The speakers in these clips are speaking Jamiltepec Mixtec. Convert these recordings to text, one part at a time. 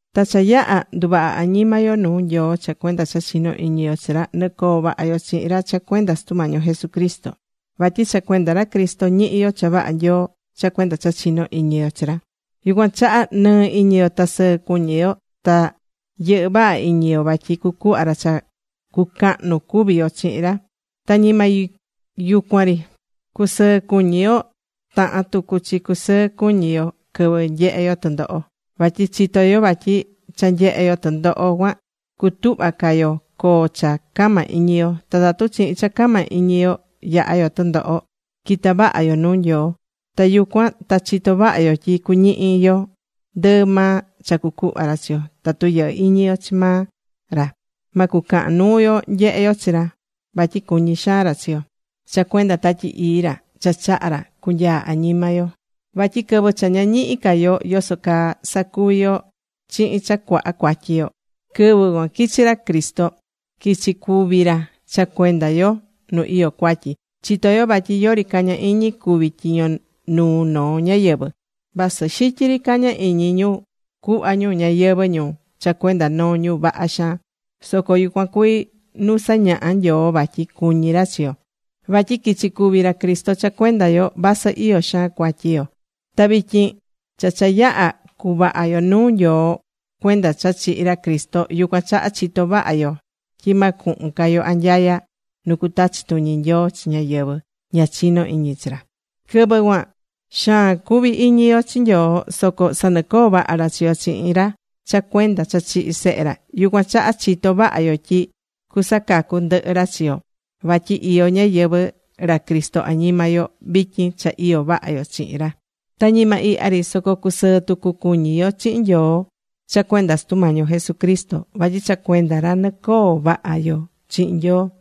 Ta cha yaha̱ nduvaha̱ añima yo nuu Nyoo cha cuenda cha chinó iñi yo chi ra, nɨcoo vaha yo chihin ra cha cuenda Sutu Mañi yo Jesucristo. Vatyi cha cuenda ra Cristo ñihí yo cha vaha Nyoo cha cuenda cha chinó iñi yo chi ra. Yucuan chaha nɨɨ iñi yo ta sɨɨ cuñí yo, ta yɨhɨ́ vaha iñi yo vatyi cucuhva ra cha cucahnu cuvi yo chihin ra. Ta ñima yucuan ri cusɨɨ cuñí yo, tahán tucu chi cusɨɨ cuñí yo quɨvɨ nyehé yo tɨndoho. Vatyi chitó yo vatyi cha nyehé yo tɨndoho cuan cutuhva ca yo coo cha cama iñi yo. Ta tatu chihin cha cama iñi yo, yahá yo tɨndoho, quita vaha yo nuu Nyoo. Ta yucuan ta chitó vaha yo tyi cuñihi yo ndɨɨ maa cha cucuhva ra chi yo. Tatu yɨhɨ́ iñi yo chi maa ra, ma cucahan nuu yo nyehé yo chi ra, vatyi cuñí xaan ra chi yo cha cuenda Tatyi Ii ra cha chaha̱ ra cunyaa añima yo. Vatyi quɨvɨ cha ña ñihi̱ ca yo yoso caa sacuvi yo chihin cha cuaha cuatyi yo, quɨvɨ cuan quichi̱ ra Cristo, quichi̱ cúvi ra cha cuenda yo ñu iyó cuatyi. Chitó yo vatyi yori caña iñi cúvi tyiño nuu noo ñáyɨvɨ. Vasɨ xityi ri caña iñi ñu cuhva ñu ñayɨvɨ̱ ñu cha cuenda noo ñu vaha xaan. Soco yucuan cuví nu sañaha̱ Nyoo vatyi cuñí ra chi yo, vatyi quichi cúvi ra Cristo cha cuenda yo vasɨ iyó xaan cuatyi yo. Ta vityin cha cha yaha̱ cuvaha yo nuu Nyoo cuenda cha chihi̱ ra Cristo, yucuan chaha chitó vaha yo tyi ma cuhun ca yo anyaya nu cutachi tuñi Nyoo chi ñáyɨvɨ ña chinó iñi chi ra. Quɨvɨ cuan xaan cuvi̱ iñi yo chi Nyoo, soco sanɨcoo̱ vaha ra chi yo chihin ra cha cuenda cha chihi̱ Sehe ra. Yucuan chaha chitó vaha yo tyi cusacacu ndɨhɨ ra chi yo vatyi iyó ñayɨvɨ̱ ra Cristo añima yo vityin cha iyó vaha yo chihin ra. Ta ñima ihya ri, soco cusɨɨ tucu cuñí yo chihin Nyoo cha cuenda Sutu Mañi yo Jesucristo, vatyi cha cuenda ra nɨcoo̱ vaha yo chihin Nyoo.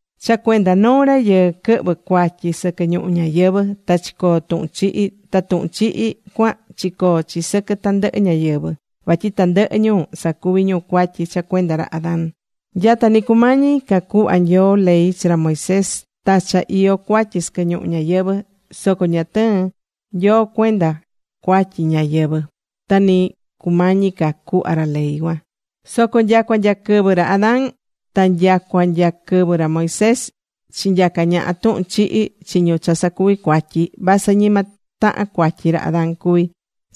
Cha cuenda noo rayɨɨ quɨhvɨ̱ cuatyi sɨquɨ ñuhu ñayɨvɨ̱ ta chicoo̱ tuhun chihi. Ta tuhun chihi cuan chicoo̱ chi sɨquɨ tandɨhɨ ñáyɨvɨ vatyi tandɨhɨ ñu sacuví ñu cuatyi cha cuenda ra Adán. Nyata nɨ cumañi ca cuhva Nyoo ley chi ra Moisés ta cha iyó cuatyi sɨquɨ ñuhu ñayɨvɨ̱, soco ña tɨɨ̱n Nyoo cuenda cuatyi ñáyɨvɨ ta nɨ cumañi ca cuhva ra ley cuan. Soco nyacua nya quɨvɨ ra Adán ta nyacua nya quɨvɨ ra Moisés, chinyaca̱ ñaha tuhun chihi chi ñu cha sacuví cuatyi, vasɨ ñima tahan cuatyi ra Adán cuví,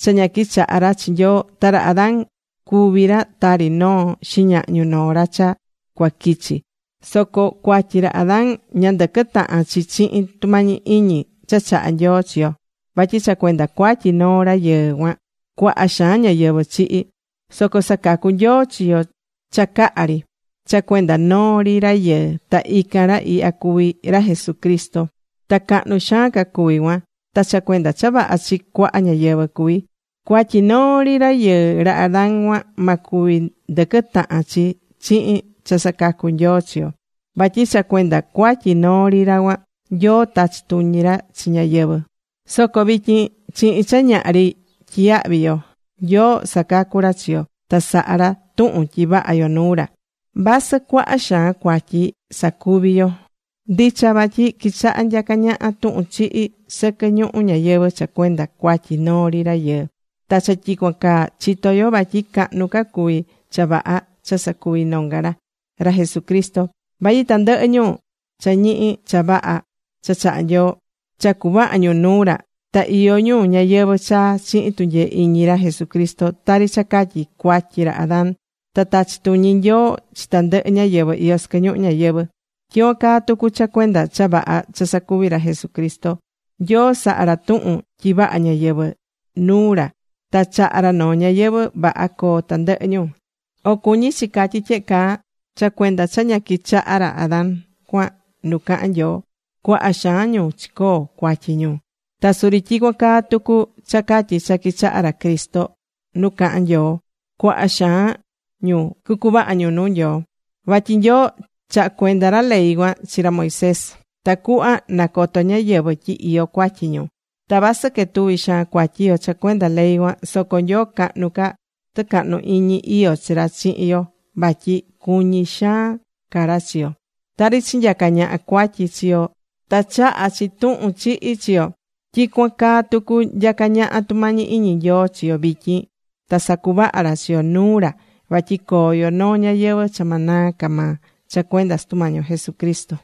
cha ña quichaha̱ ra chi Nyoo. Ta ra Adán cuví ra tari noo xiñahñu noo ra cha cua quichi. Soco cuatyi ra Adán ña ndɨquɨ́ tahan chi chihin tumañi iñi cha chaha̱ Nyoo chi yo. Vatyi cha cuenda cuatyi noo rayɨɨ cuan, cuaha xaan ñáyɨvɨ chihi̱. Soco sacacú Nyoo chi yo cha caha ri, cha cuenda noo ri rayɨɨ ta ican ra ihya cuví ra Jesucristo. Ta cahnu xaan ca cuví cuan. Ta cha cuenda cha vaha chi cuaha ñáyɨvɨ cuví. Cuatyi noo ri rayɨɨ ra Adán cuan, ma cuvi ndɨquɨ tahan chi chihin cha sacacú Nyoo chi yo. Vatyi cha cuenda cuatyi noo ri ra cuan, Nyoo tachí tuñi ra chi ñáyɨvɨ. Soco vityin chihin cha ñahri tyiyahví yo, Nyoo sacacú ra chi yo ta sahá ra tuhun tyi vaha yo nuu ra, vasɨ cuaha xaan cuatyi sacuvi̱ yo. Ndicha vatyi quichaha̱ nyaca ñaha tuhun chihi sɨquɨ ñuhu ñayɨvɨ̱ cha cuenda cuatyi noo ri rayɨɨ. Ta cha tyicuan caa chitó yo vatyi cahnu ca cuví cha vaha cha sacuvi̱ nonga ra, ra Jesucristo. Vatyi tandɨhɨ ñu cha ñihi̱ cha vaha cha chahá Nyoo, cha cuvaha̱ ñu nuu ra, ta iyó ñu ñayɨvɨ̱ chaa chihin tunyee iñi ra Jesucristo. Tari cha catyi cuatyi ra Adán ta tachí tuñi Nyoo chi tandɨhɨ ñáyɨvɨ iyó sɨquɨ ñuhu ñayɨvɨ̱, tyicuan caa tucu cha cuenda cha vaha cha sacuvi̱ ra Jesucristo, Nyoo saha̱ ra tuhun tyi vaha ñáyɨvɨ nuu ra ta chahá ra noo ñayɨvɨ̱ vaha coo tandɨhɨ ñu. O cuñí chi catyí tyehe caa: Cha cuenda cha ña quichaha̱ ra Adán cuan nu cahán Nyoo, cuaha xaan ñu chicoo̱ cuatyi ñu. Ta suri tyicuan caa tucu cha catyi cha quichaha̱ ra Cristo nu cahán Nyoo, cuaha xaan ñu cucuvaha ñu nuu Nyoo. Vatyi Nyoo chaha̱ cuenda ra ley cuan chi ra Moisés tacuhva nacoto ñáyɨvɨ tyi iyó cuatyi ñu. Ta vasɨ quetuví xaan cuatyi yo cha cuenda ley cuan, soco Nyoo cahnu ca tucahnu iñi iyó chi ra chihin yo vatyi cuñí xaan ca ra chi yo. Tari chinyaca̱ ñaha cuatyi chi yo ta chaha̱ chi tuhun chihi chi yo, tyicuan caa tucu nyacá ñaha tumañi iñi Nyoo chi yo vityin ta sacuvaha ra chi yo nuu ra vatyi coo yo noo ñayɨvɨ̱ cha ma naa ca maa cha cuenda Sutu Mañi yo Jesucristo.